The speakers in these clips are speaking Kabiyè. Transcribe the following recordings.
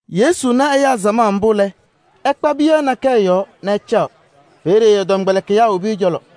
Yesu na ɛyaa samaɣ mbʋ lɛ, ɛkpa piyaɣ nakɛyɛ yɔɔ nɛ ɛcaɣ. Peeye ɛ-tɔmkpɛlɩkɩyaa wobi ɛ-cɔlɔ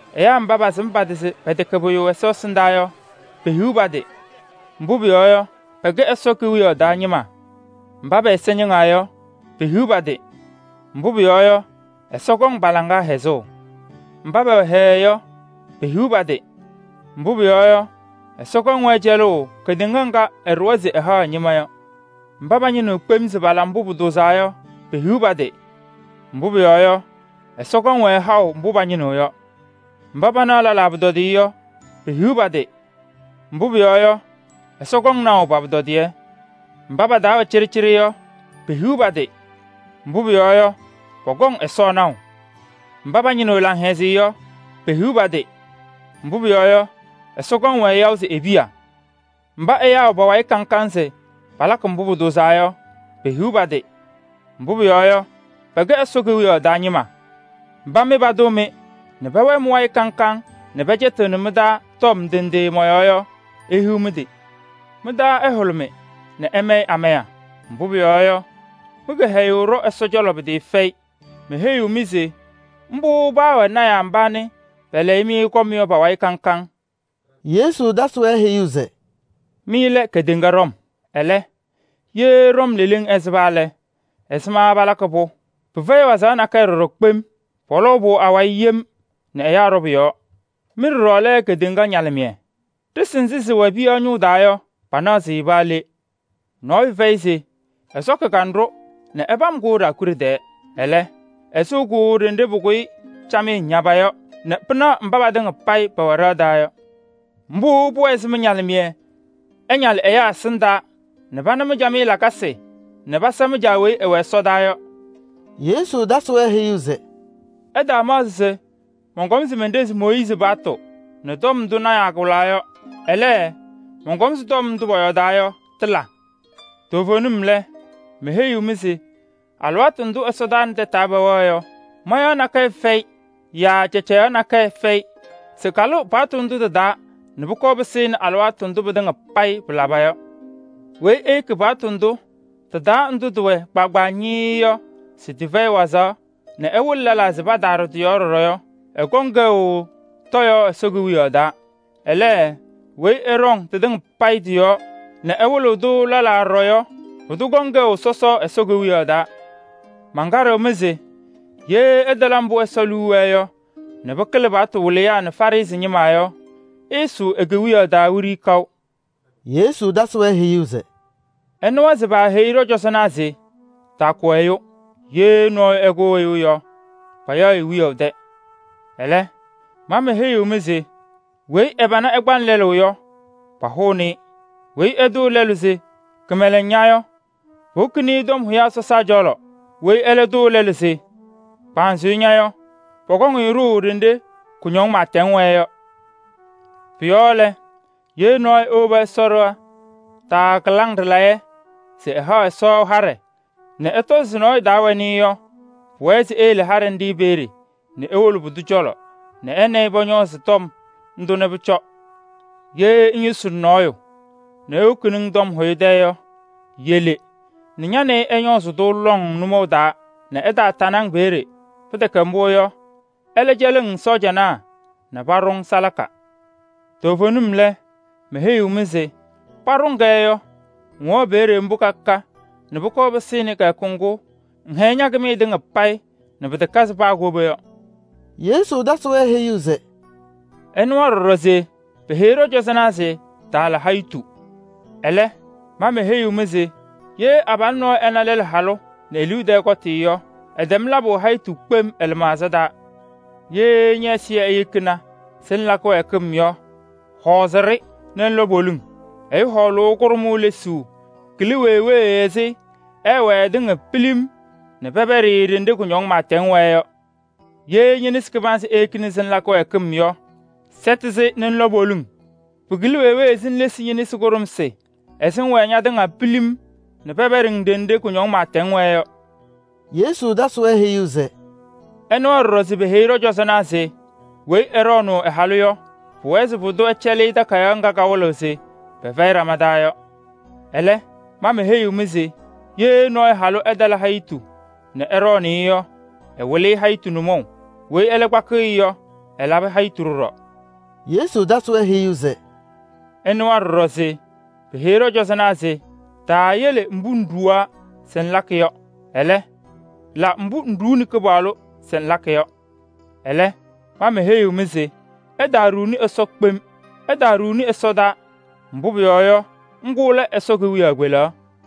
“Ɛyaa mba pasɩm pa-tɩ se pɛtɛkɛ pʋyʋ Ɛsɔ ɛsɩndaa yɔ, pehiɣ pa-tɩ! Mbʋ pʋyɔɔ yɔ, pɛkɛ Ɛsɔ Kewiyaɣ taa ñɩma. Mba pɛ-ɛza ñɩŋaa yɔ, pehiɣ pa-tɩ! Mbʋ pʋyɔɔ yɔ, Ɛsɔ kɔŋ pa-laŋa hɛzʋʋ. Mba pɛwɛ hɛɛɛ yɔ, pehiɣ pa-tɩ! Mbʋ pʋyɔɔ yɔ, Ɛsɔ kɔŋ-wɛ cɛlʋʋ kedeŋa ŋga ɛɖʋwa se ɛhaɣ ɛ-ñɩma yɔ. Mba pañɩnɩɣ kpem se pala mbʋ pʋtʋʋzaa yɔ, pehiɣ pa-tɩ! Mbʋ pʋyɔɔ yɔ, Ɛsɔ kɔŋ-wɛ haʋ mbʋ pañɩnɩɣ yɔ. Mba panaɣ lɛlaa pʋtɔdɩyɛ yɔ, pehiɣ pa-tɩ! Mbʋ pʋyɔɔ yɔ, Ɛsɔ kɔŋ naʋ pa-pʋtɔdɩyɛ. Mba pa-taa wɛ cɩɖɩcɩɖɩ yɔ, pehiɣ pa-tɩ! Mbʋ pʋyɔɔ yɔ, pɔkɔŋ Ɛsɔ naʋ. Mba pañɩnɩɣ laŋhɛzɩyɛ yɔ, pehiɣ pa-tɩ! Mbʋ pʋyɔɔ yɔ, Ɛsɔ kɔŋ-wɛ yaʋ se e-piya. Mba pɛwɛ pa-wayɩ kaŋ kaŋ se palakɩ mbʋ pʋtʋʋzaa yɔ, pehiɣ pa-tɩ! Mbʋ pʋyɔɔ yɔ, pɛkɛ Ɛsɔ Kewiyaɣ taa ñɩma. “Mba mɩ patʋʋ-mɩ nɛ pɛwɛɛ mɩ-wayɩ kaŋ kaŋ nɛ pɛcɛtɩɣnɩ mɩ-taa tɔm ndɩ ndɩ mɔ-yɔɔ yɔ, ihiɣ mɩ-tɩ! Mɩ-taa ɛhʋlʋmɩ nɛ ɩmayɩ amaya, mbʋ pʋyɔɔ yɔ, mɩ-kɩhɛyʋʋ ɖɔ Ɛsɔ cɔlɔ pɩtɩɩfɛyɩ. Meheyiɣ-mɩ se mbʋ paawɛ lɔɔyɩsɩ tɩnaa mba pɛlɛyɩ-mɩ kɔm yɔ pa-wayɩ kaŋ kaŋ.” Yesu tasɩ-wɛ heyuu se: “Mɩ lɛ kedeŋa ɖɔm. Ɛlɛ, ye ɖɔm leleŋ ɛsɩba lɛ, ɛzɩma palakɩ-pʋ? Pɩfɛyɩ wazaɣ nakɛyɛ ɖɔɖɔ kpem. Pɔlɔʋ-pʋ awayɩ yem nɛ ɛyaa ɖɔ pʋ-yɔɔ. “Mɩ ɖɔɖɔ lɛ kedeŋa ñalɩmɩyɛ. Ɖɩsɩ nzɩ sɩwɛ piyaɣ ñʋʋ taa yɔ, panaɣ-sɩ paa le. Nɔɔyʋ fɛyɩ se ɛsɔkɩ kanɖʋ nɛ ɛpam-kʋ ɖaakuɖe tɛɛ. Ɛlɛ, ɛsɩɣ-kʋ ɖenɖe pʋkʋyɩ camɩyɛ ñaba yɔ nɛ pɩnaɣ mba patɩŋa payɩ pɛwɛ ɖɩɣa taa yɔ. Mbʋ pʋmʋnaa se mɩ-ñalɩmɩyɛ ɛñalɩ ɛyaa ɛsɩndaa nɛ pana mɩ-camɩyɛ lakasɩ nɛ pasa mɩ-Caa weyi ɛwɛ ɛsɔdaa yɔ.” Yesu tasɩ-wɛ heyuu se: “Ɩtaamaɣzɩ se mɔnkɔm se menɖezi Mooyiizi paɣtʋ nɛ tɔm ndʋ lɔɔyɩsɩ tɩnaa wɩlaa yɔ. Ɛlɛ, mɔnkɔm se tɔm ndʋ pɔyɔɔdaa yɔ tɩla. Toovenim lɛ, meheyiɣ-mɩ se alɩwaatʋ ndʋ ɛsɔtɔnʋʋ nɛ tɛtʋ pɛwɛɣ yɔ, mayaɣ nakɛyɛ yaa cacayaɣ nakɛyɛ fɛyɩ se kalɩɣ paɣtʋ ndʋ tɩ-taa nɛ pʋkɔɔ pɩsɩnɩ alɩwaatʋ ndʋ pɩtɩŋa payɩ pɩlaba yɔ. Weyi eyeki paɣtʋ ndʋ tɩ-taa ndʋ tɩwɛ kpaagbaa ñɩɩɩ yɔ se tɩfɛyɩ wazaɣ nɛ ɛwɩlɩ lɛlaa se pataaɖɔ tɩ-yɔɔ ɖɔɖɔ yɔ, ɛkɔŋ kɛʋ tɔyaɣ Ɛsɔ Kewiyaɣ taa. Ɛlɛ, weyi ɛɖɔŋ tɩtɩŋa payɩ tɩ-yɔɔ nɛ ɛwɩlɩɣ-tʋ lɛlaa ɖɔɖɔ yɔ, pʋdʋ kɔŋ kɛʋ sɔsɔ Ɛsɔ Kewiyaɣ taa. Mankaɖɩɣ-mɩ se ye ɩtala mbʋ Ɛsɔ liu wɛɛ yɔ nɛ pɩkɩlɩ paɣtʋ wɩlɩyaa nɛ Farɩsɩ ñɩma yɔ, ɩɩsʋʋ e-Kewiyaɣ taa wiɖiyi kaʋ.” Yesu tasɩ-wɛ heyuu se: “Ɩnɩwa se paaheyi ɖɔ-cɔzɔnaa se: ‘Taakʋ ɛyʋ. Ye nɔɔyʋ ɛkʋ ɛyʋ yɔ, payaɣ-ɩ wiyaʋ tɛ.’ Ɛlɛ, ma meheyiɣ-mɩ se weyi ɛ-pana kpaɣnɩ lɛlʋ yɔ, pahʋʋnɩ-ɩ. Weyi ɛtʋʋ lɛlʋ se: ‘Kɩmɛlɛŋ ña!’ Yɔ, powokini-i tɔm hʋyaa sɔsaa cɔlɔ. Weyi ɛlɛ tʋʋ lɛlʋ se: ‘Kpanzʋyʋ ña!’ Yɔ, pɔkɔŋ-ɩ ɖʋʋ ɖenɖe kʋñɔŋ pɩɩtɛŋ wɛɛ yɔ. Pʋ-yɔɔ lɛ, ye nɔɔyʋ ewobi Ɛsɔ ɖɩɣa taa kɩlaŋ ɖɩlayɛ se ɛhaɣ Ɛsɔ haɖɛ nɛ ɛtɔzɩ se nɔɔyʋ taa wɛnɩ-ɩ yɔ, pʋwɛɛ se eyele haɖɛ nɖɩ peeye nɛ ewolo pʋdʋ cɔlɔ nɛ ɛ nɛ ɩ pɔñɔɔzɩ tɔm ndʋ nɛ pʋcɔ. “Ye ŋyʋsɩnɩ nɔɔyʋ nɛ ewokini-ŋ tɔm hʋyʋ tɛ yɔ, yele nɛ ña nɛ ɩ ɩñɔɔzɩ-tʋ lɔŋ nʋmɔʋ taa nɛ ɛtaatanɩ-ŋ. Pɩtɛkɛ mbʋ yɔ, ɛlɛ cɛlɩɣ-ŋ sɔɔjanaa nɛ paba ɖʋ-ŋ salaka. Toovenim lɛ, meheyiɣ-ŋ se: paɖʋ-ŋ-kɛ yɔ, ŋwɛɣ peeye mbʋ ka ka nɛ pʋkɔɔ pɩsɩnɩ kɩyakʋ ŋgʋ ŋhɛyɩ ña-kɩmɩyɛ tɩŋa payɩ nɛ pɩtakazɩ paa koba yɔ.” Yesu tasɩ-wɛ heyuu se: “Ɩnɩwa ɖɔɖɔ se peheyi ɖɔ-cɔzɔnaa se: ‘Taala hayitu.’ Ɛlɛ, ma meheyiɣ-mɩ se: ye abalʋ nɔɔyʋ ɛna lɛlʋ halʋ nɛ e-liu tɛɛ kɔtɩ yɔ, ɛtɛm labʋ hayitu kpem ɛ-lɩmaɣza taa. Ye ñɛ-ɛzɩyɛ eyekina se ŋla kɩwɛɛkɩm yɔ, hɔɔzɩ-ɖɩ nɛ ŋlɔ poliŋ. Ɛyʋ hɔɔlʋʋ kʋɖʋmʋʋ lesuu kɩlɩ wee wee ɛzɩ ɛɛwɛɛ ɛtɩŋa pilim nɛ pɛpɛɖɩ-ɩ ɖenɖe kʋñɔŋ pɩɩtɛŋ wɛɛ yɔ. Ye ñe-nesi kɩbanzɩ eyekina se ŋla kɩwɛɛkɩm yɔ, sɛtɩ-sɩ nɛ ŋlɔ poliŋ. Pɩkɩlɩ wee wee se ŋlesi ñe-nesi kʋɖʋmsɩ ɛzɩ ŋŋwɛɛ ñatɩŋa pilim nɛ pɛpɛɖɩ-ŋ ɖenɖe kʋñɔŋ pɩɩtɛŋ wɛɛ yɔ.” Yesu tasɩ-wɛ heyuu se: “Ɩnɩwa ɖɔɖɔ se peheyi ɖɔ-cɔzɔnaa se: ‘Weyi ɛɖɔɔnʋʋ ɛ-halʋ yɔ, pʋwɛɛ se pʋdʋ ɛcɛlɩ-ɩ takayaɣ ŋga kawɩlɩɣ se pɛfɛyɩ ɖama taa yɔ.’ Ɛlɛ, ma meheyiɣ-mɩ se: ye nɔɔyʋ halʋ ɛtala hayitu nɛ ɛɖɔɔnɩ-ɩ yɔ, ɛwɩlɩ-ɩ hayitu nʋmɔʋ. Weyi ɛlɛ kpakɩɣ-ɩ yɔ, ɛlabɩ hayitu ɖɔɖɔ.” Yesu tasɩ-wɛ heyuu se: “Ɩnɩwa ɖɔɖɔ se peheyi ɖɔ-cɔzɔnaa se: ‘Taayele mbʋ ŋɖuwa se ŋlakɩ yɔ. Ɛlɛ, la mbʋ ŋɖuuni Kɩpaɣlʋ se ŋlakɩ yɔ.’ Ɛlɛ, ma meheyiɣ-mɩ se: ɩtaaɖuuni Ɛsɔ kpem: ɩtaaɖuuni ɛsɔtɔnʋʋ, mbʋ pʋyɔɔ yɔ, ŋgʋ lɛ Ɛsɔ kewiyaɣ kpelaɣ.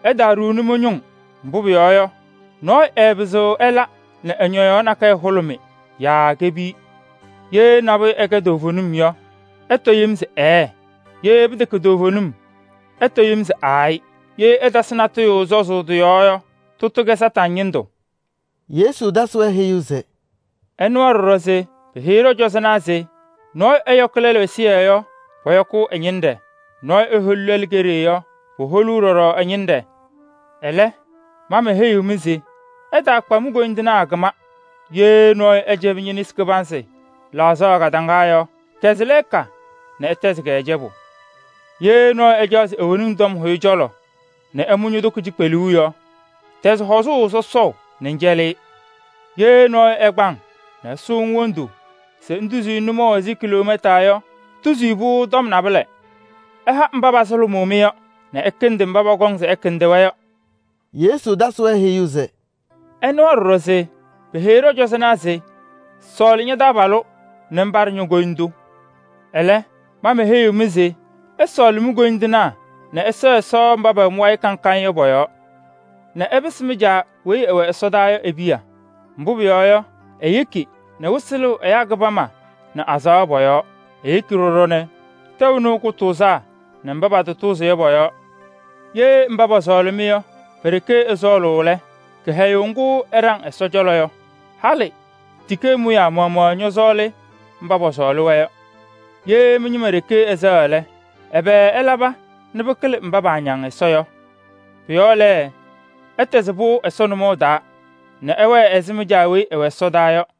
Ɩtaaɖuuni mɩ-ñʋŋ, mbʋ pʋyɔɔ yɔ, nɔɔyʋ ɛɛpɩzɩɣ ɛla nɛ ɛ-ñɔyaɣ nakɛyɛ hʋlʋmɩ yaa kepiyi. Ye nabʋyʋ ɛkɛ toovenim yɔ, ɩtɔ yem se: ‘Ɛɛɛ!’ Ye pɩtɛkɛ toovenim yɔ, ɩtɔ yem se: ‘Aayɩ!’ Ye ɩtasɩ natʋyʋ sɔzʋʋ yɔ, tʋtʋ kɛnɩ Kañadʋ Satanɩ ñɩndʋ.” Yesu tasɩ-wɛ heyuu se: “Ɩnɩwa ɖɔɖɔ se peheyi ɖɔ-cɔzɔnaa se: ‘Nɔɔyʋ ɛyɔkɩ lɛlʋ ɛzɩyɛ yɔ, pɔyɔkʋʋ ɛ-ñɩnɖɛ. Nɔɔyʋ eholi lɛlʋ keɖe yɔ, poholuu ɖɔɖɔ ɛ-ñɩnɖɛ.’ Ɛlɛ, ma meheyiɣ-mɩ se: ɩtaakpa mi-koyindinaa kɩma. Ye nɔɔyʋ ɛcɛbɩ ñe-nesi kɩbanzɩ laɣzaɣ kadaŋa yɔ, kɛzɩ lɛɛka nɛ ɛtɛzɩ-kɛ cɛbʋ. Ye nɔɔyʋ ɛcaɣ se ewoni-ŋ tɔm hʋyʋ cɔlɔ nɛ ɛmʋ ño-toko cikpeluu yɔ, tɛzɩ hɔzʋʋ sɔsɔʋ nɛ ŋcɛlɩ-ɩ. Ye nɔɔyʋ ɛkpa-ŋ nɛ ɛsʋʋ-ŋ wondu se ŋtuzi-i nʋmɔʋ ɛzɩ kiloomɛta yɔ, tuzi-i pʋ-tɔm naalɛ. Ɩha mba pasʋlʋmʋʋ-mɩ yɔ nɛ ɩkɩndɩ mba pɔkɔŋ se ɩkɩndɩ-wɛ yɔ.” Yesu tasɩ-wɛ heyuu se: “Ɩnɩwa ɖɔɖɔ peheyi ɖɔ-cɔzɔnaa se: ‘Sɔɔlɩ ña-taabalʋ nɛ ŋpaɖɩ ño-koyindu.’ Ɛlɛ, ma meheyiɣ-mɩ se: ɩsɔɔlɩ mi-koyindinaa nɛ ɩsɛɛ Ɛsɔ mba pɛwɛ mɩ-wayɩ kaŋ kaŋ yɔ pɔ-yɔɔ nɛ ɩpɩsɩ mɩ-Caa Ɛsɔ weyi ɛwɛ ɛsɔdaa yɔ e-piya. Mbʋ pʋyɔɔ yɔ, eyeki nɛ wɩsɩ lɩɣ ɛyaa kɩbama nɛ azaɣa pɔ-yɔɔ. Eyeki ɖɔɖɔ nɛ tɛʋ nɩɣ kʋtʋʋzaa nɛ kɩtatʋʋzɩŋ pɔ-yɔɔ. Ye mba pɔsɔɔlɩ-mɩ yɔ pe-ɖeke ɩsɔɔlʋʋ lɛ, kɩhɛyʋʋ ŋgʋ ɩɖaŋɩɣ Ɛsɔ cɔlɔ yɔ? Halɩ tikee mʋyaa maɣmaɣ ñɔsɔɔlʋʋ mba pɔsɔɔlɩ-wɛ yɔ. Ye mɩ-ñɩma ɖeke ɩsɛɣ lɛ, ɛbɛ ɩlaba nɛ pɩkɩlɩ mba paañaŋ Ɛsɔ yɔ? Pʋ-yɔɔ lɛ, ɩtɛzɩ pɩʋ Ɛsɔ nʋmɔʋ taa nɛ ɩwɛɛ ɛzɩ mɩ-Caa weyi ɛwɛ ɛsɔdaa yɔ.”